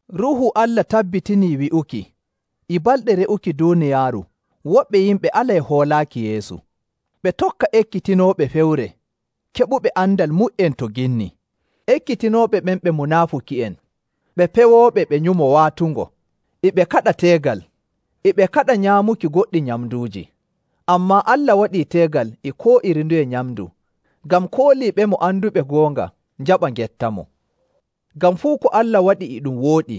Ruuhu Allah tabbitinii wi'uki e balɗe re'uki duuniyaaru woɓɓe yimɓe alay hoolaaki Yeesu, ɓe tokka ekkitinooɓe fewre keɓuɓe andal mu''en to ginni. Ekkitinooɓe ɓen ɓe munaafuki'en, ɓe pewooɓe ɓe nyumo waatungo. E ɓe kaɗa teegal, e ɓe kaɗa nyaamuki goɗɗi nyamnduuji. Ammaa Allah waɗii teegal e koo iri nduye nyamndu ngam kooliiɓemo anduɓe goonga njaɓa ngettamo. Ngam fuu ko Allah waɗi e ɗum wooɗi.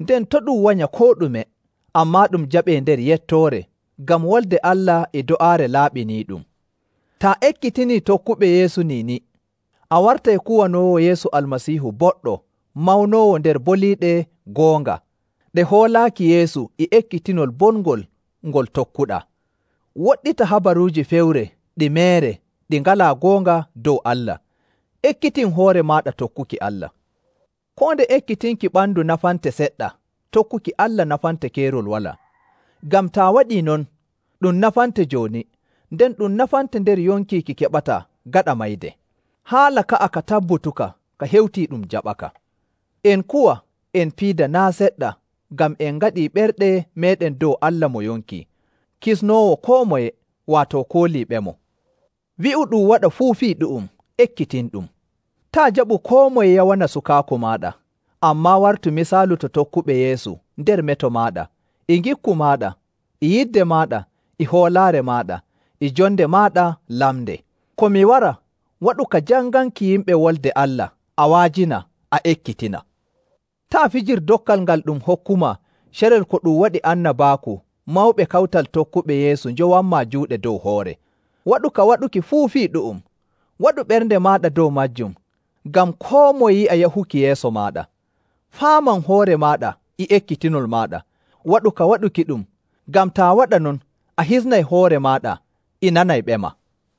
Nden to' ɗum wanya koo ɗume, ammaa ɗum jaɓee nder yettoore, ngam Wolde Allah e do'aare laaɓiniiɗum. Taa ekkitinii tokkuɓe Yeesu niini, a wartay kuwanoowo Yeesu Almasiihu boɗɗo mawnoowo nder boliiɗe goonga ɗe hoolaaki Yeesu e ekkitinol bongol ngol tokkuɗaa. Woɗɗita habaruuji fewre ɗi meere ɗi ngalaa goonga dow Allah. Ekkitin hoore maaɗa tokkuki Allah. Koo nde ekkitinki ɓandu nafante seɗɗa, tokkuki Allah nafante keerol walaa. Ngam taa waɗii non, ɗum nafante jooni, nden ɗum nafante nder yonki ki keɓataa gaɗa mayde. Haala ka'a ka tabbutuka ka hewtii ɗum jaɓaka. En kuwa, en piida naa' seɗɗa ngam en ngaɗii ɓerɗe meeɗen dow Allah mo yonki, Kisnoowo koo moye, waato kooliiɓemo. Wi'u ɗum waɗa fuu fii ɗu'um, ekkitinɗum. Taa' jaɓu koo moye yawana sukaaku maaɗa, ammaa wartu misaalu to tokkuɓe Yeesu nder meto maaɗa, e ngikku maaɗa, e yidde maaɗa, e hoolaare maaɗa, e jonde maaɗa lamnde. Ko mi wara, waɗu ka janganki yimɓe Wolde Allah a wa'ajina, a ekkitina. Taa' fijir dokkal ngal ɗum hokkumaa carel ko ɗum waɗi annabaaku mawɓe kawtal tokkuɓe Yeesu njowanmaa juuɗe dow hoore. Waɗu ka waɗuki fuu fii ɗu'um, waɗu ɓernde maaɗa dow maajum ngam koo moye yi'a yahuki yeeso maaɗa. Faaman hoore maaɗa e ekkitinol maaɗa; waɗu ka waɗukiɗum, ngam taa waɗa non, a hisnay hoore maaɗa e nanayɓema.